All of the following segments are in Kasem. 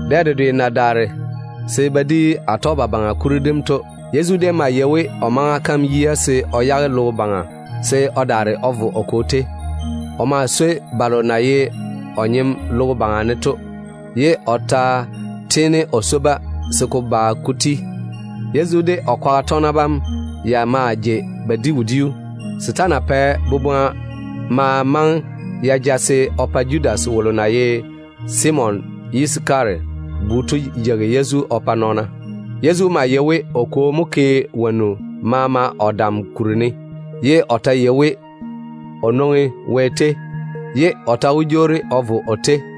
Dɛ dedwe na daare se ba di Atɔgebabaŋa kuri dem to, Yezu déem maa yei we o maŋa kam yia se o yage logo baŋa se o daare o vo o Kwo tei. O maa swoi balo na ye o nyem logo baŋa ne to, ye o ta tiini o swo-ba se ko yi o ŋwea tiim. Yezu de o kwaga tɔgena bam déem maa jei ba di wodiu. Setaana pɛ boboŋa ma maŋe ya ja se o pa Judas wolo na ye Simon Yisakara bu to yeigi Yezu o pa nɔɔna. Yezu maa yei we o Kwo mo pɛ‑o dam wonnu maama baŋa ne, ye o ta yei we o nwoŋi Wɛ tei mo, ye o ta wó jwoori o vo Wɛ tei.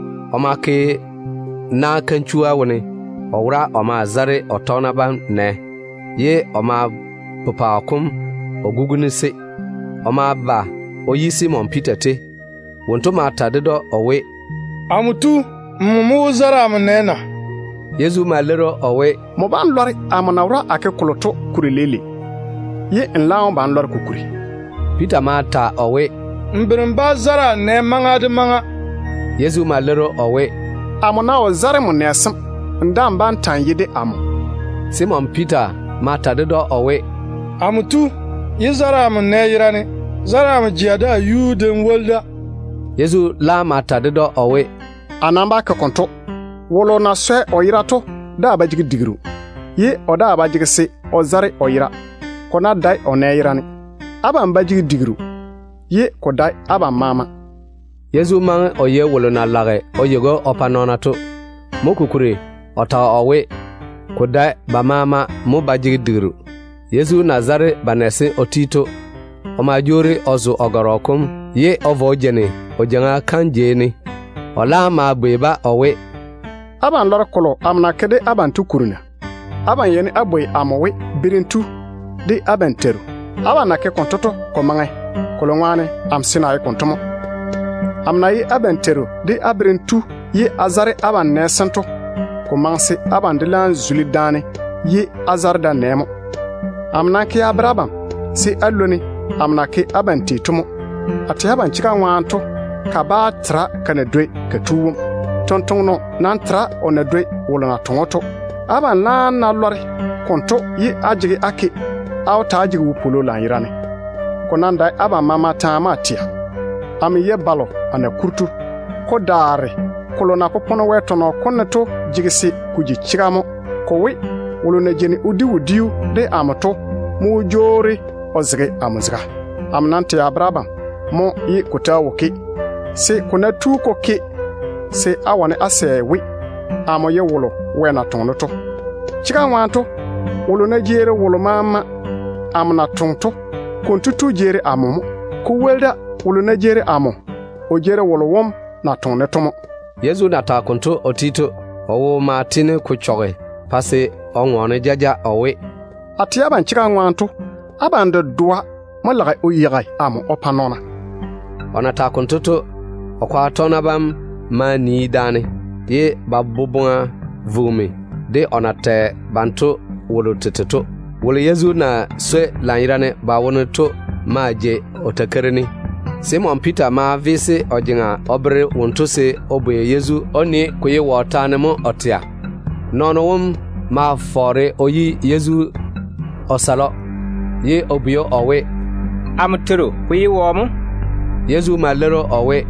O ma ke na kanchua wone o wora o maa zare o tɔgena bam nɛ, ye o ma pepaao kom o guguni-se. O ma ba o yi Simon Piita tei. Wonto ma ta ded‑o o we, “Amo tu, nmo mo wó zare amo nɛ na?” Yezu ma leiri‑o o we, “Nmo bá‑n lɔre amo na wora a ke kolo to kuri leile, ye n laam wó ba n lɔre ko kuri.” Piita ma ta o we, “N bere n bá‑n zare a nɛ kɔtaa.” Yezu ma leiri‑o o we, “Amo ná wo zare n nɛ sem, n daa‑n bá ta‑n ye amo nɔɔno.” Simon Piita ma ta ded‑o o we, “Amo tu, yé zare amo nɛ yerane, zare a jea de a yuu de n woli da.” Yezu laam ma ta ded‑o o we, “Wolo na swɛ o yera to daa ba jege digiru, ye o daa ba jege se o zare o yera, ko ná dae o nɛ yerane. Abam ba jege digiru, ye ko dae abam maama.” Yezu maŋe o yei wolo na lage o yeigi‑o o pa nɔɔna to. Mo kokuri o tage o we, ko dae ba maama mo ba jege digiru. Yezu na zare ba nɛ sem o ti to, o ma jwoori o zo o gɔrɔ kom ye o vo o jeini o jeiŋa kam jei ne. O laam ma bwei-ba o we, “Abam lɔre kolo amo na ke de abam to kuri na? Á yeini á bwoi amo we, Berem tu, de abam Teiru. Abam na ke konto to, ko maŋe, kolo ŋwaane amo seene a ye konto mo. Amo na ye abam Teiru de á Berem tu ye a zare abam nɛ sem to, ko maŋe se abam de laam zuli daane ye á zare da-nɛ mo. Amo nam ke a bere abam se á lwoni amo na ke abam tei to mo. A tɛ abam chega ŋwaane to, kabaa tera ka na dwoi ka yuu tu. Tontoŋeno nam tera o na dwoi wolo na toŋe‑o to. Abam laam na lɔre konto to, á ná seene á ke konto dwoŋi, á wó ta‑á jege yu-ywoŋo lanyerane. Ko nam dae abam maama taane mo a tɛa. Amo yei balo a na kuri to. Ko daare kolo na popone Wɛ tɔnɔ kom ne to jege se ko ji chega mo, ko we, ‘Wolo na jeini o di wodiu de amo to mo jwoori o zege amo zega.’ Amo nam wuuri a ta wonnu tento a bere abam mo ye te ta wo ke, se te ná tu te ke, se á wane á sɛ we amo ye wolo Wɛ na toŋe to. Chega ŋwaane to, nɔɔno ná jeeri wolo maama amo na toŋe to, konto tu jeeri amo mo. Ko woli da, wolo maama ná jeeri amo, kotu jeeri wolo wom na toŋe-ne to mo.” Yezu na tage konto o ti to, o wo ma tiini ko chɔge pa se o ŋɔɔne jaja o we, “A tɛ abam chega ŋwaane to, abam dedoa mo lage o yeigi amo o pa nɔɔna.” O na tage konto to, o kwaga tɔgena bam maa nii daane, ye ba boboŋa vugimi de o na tɛ banto wolo tete taane to. Wolo Yezu na swoi lanyerane ba wone to maa jei o takeiri ne. Simon Piita ma yeese o jeŋa o bere wonto se o bwei Yezu o nii, ko ye wɔ taane mo o tɛa. Nɔɔno wom ma fɔɔre o yi Yezu o sale‑o, ye o bwei o we, “Amo Teiru, ko ye wɔ mo?” Yezu ma leiri o we,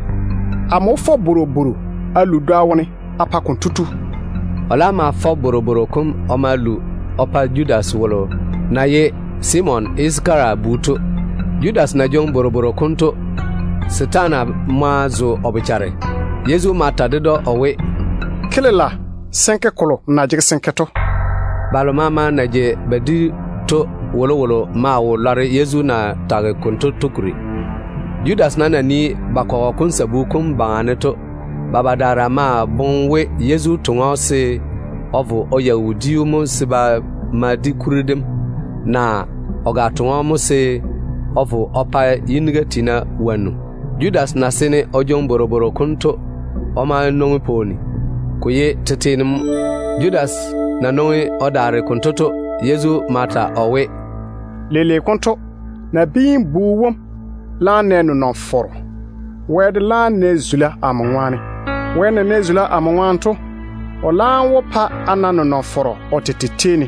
“Amo wó fɔ bworobworo a lu dwoa wone a pa konto tu.” O laam ma fɔ bworobworo kom o ma lu o pa Judas wolo na ye Simon Yisakara bu to. Judas na jwoŋi bworobworo kom to, setaane ma zo o bochare. Yezu ma ta ded‑o o we, “Ke lela se n ke kolo nmo na jege se n ke to.” Balo maama na jei ba di to wolowolo maa wo lɔre Yezu na tage kolo ded‑o to kuri. Judas nam na nii ba kɔgɔ kom sabu kom baŋa ne to, ba badaara maa boŋe we Yezu toŋe‑o se o vo o yeigi wodiu mo se ba ma di kuri dem, naa o ga toŋe‑o se o vo o pa yiniga tiina wonnu mo. Judas na seene o jwoŋi bworobworo kom to, o ma nwoŋi pwooni. Ko déem ye tete ne mo. Judas na nwoŋi o daare konto to, Yezu ma ta o we, “Leile konto amo Nabiin-bu wom wó na nenɔŋ-fɔrɔ. Wɛ tete de wó na zula amo ŋwaane. Wɛ na nɛ zula amo ŋwaane to, o laam wó pa a na nenɔŋ-fɔrɔ o tete tei ne.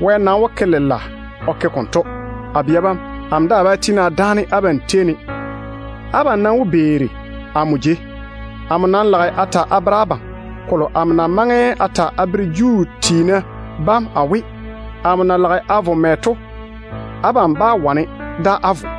Wɛ nam wó ke lela o ke konto o pa-ne. A bia bam, amo daa bá tiini a dáane abam tei ne. Abam nam wó ba á beeri amo jei. A nam lage a ta a bere abam kolo amo na maŋe a ta a bere Juu tiina bam a we, amo na lage a vo mɛ to, abam bá wane da á vo.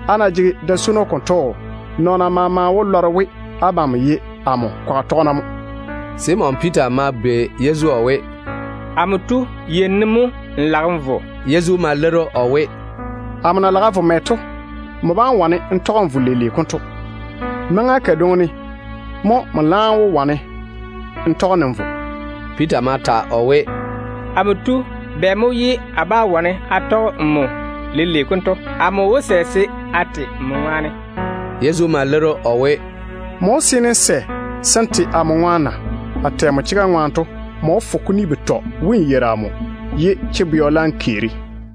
Á ná jege da-swono konto dwoŋi, nɔɔna maama wó lɔre we abam ye a kwaga tɔgena mo.” Simon Piita ma bwei Yezu o we, “Amo tu, yei ne mo n lage n vo?” Yezu ma leiri o we, “Amo na lage a vo mɛ to, nmo bá wane n da n vo leile konto. Maŋa kadwoŋi ne mo nmo laam wó wane n tɔge-ne n vo.” Piita ma ta o we, “Amo tu, bɛ mo ye a bá wane a tɔge nmo leile konto? Amo wó sɛ se a te nmo ŋwaane.” Yezu ma leiri‑o o we, “Nmo wó seene n sɛ se n te amo ŋwaane na? A tɛ nmo chega ŋwaane to, nmo wó fo kuni betɔ we n yeiri amo, ye chebɛɔ laam keeri.”